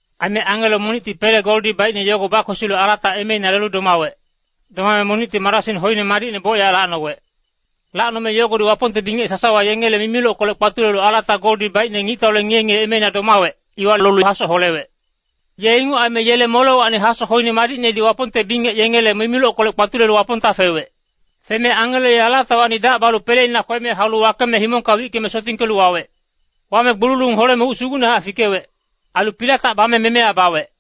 Aime angelo monicti pele goldi baicne yogo bakwesilu alata emeina lelu domawec. Domame monicti marasing hoine madicne bocyac lacnowec. Lacnome yogodi Wapongte bingec sasawa yengele mimilockolec kpatulelu alata goldi baicne ngictaule ngiye-ngiye emeina domawec, iwa lolu hasoc holewec. Ye inguc aime yele molewacni hasoc hoine madicnedi Wapongte bingec yengele mimilockolec kpatulelu Wapongta fewec. Feme angelo ye alatawacni dac balu peleina kweme haulu wakeme himongka wickeme sotingkelu wawec. Wame gbululung holeme uc sugucnehac fikewec. Ailu pilatac bame memeya bawec.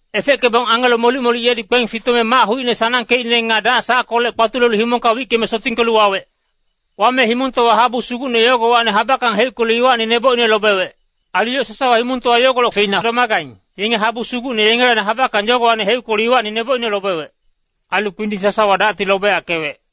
Efeckebong angelo molic-molic yedi kpeng fitome mac hucine sanangkeicne nga dac sackolec kpatulelu himongka wickeme sotingkelu wawec. Wame himongtowa habu sugucne yogowacni habackang heuckelu iwacni nebocine lobewec. Ailu yoc sasawa himongtowa yogolec feina domagaing, yenge habu sugucne yengelacni habackang yogowacni heuckelu iwacni nebocine lobewec. Ailu kpinding sasawa dacti lobeyackewec.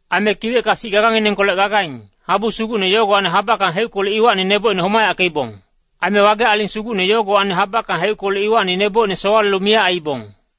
Aime kiwecka sic gaganginengkolec gagaing, habu sugucne yogowacni habackang heuckelu iwacni nebocine homayackeibong. Ailu wage aling sugucne yogowacni habackang heuckelu iwacni nebocine sowalelu miyac aiibong.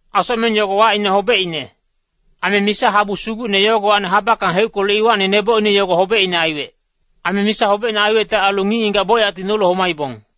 Asocmeng yogo wacine Hobecine. Aime misa habu sugucne yogowacni habackang heuckelu iwacni nebocine yogo hobecine aiwec. Aime misa hobecine aiwecte ailu ngic-ngigac bocyacti nolu homaibong.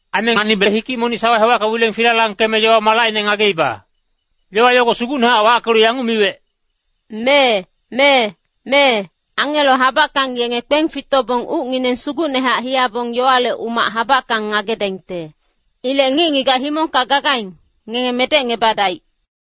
Aime nganibe hikic monic sawa hewacka wileng filalangkeme yowa-malacine ngageiba. Yowa yogo sugucnehac wackelu yanguc miwec, “Mee, mee, mee, angelo habackang yenge kpeng fitobong ucngineng sugucnehac hiyabong yowale umac habackang ngagedaingte. Ilec ngic-ngigac himongka gagaing, ngenge medecngebadaic.”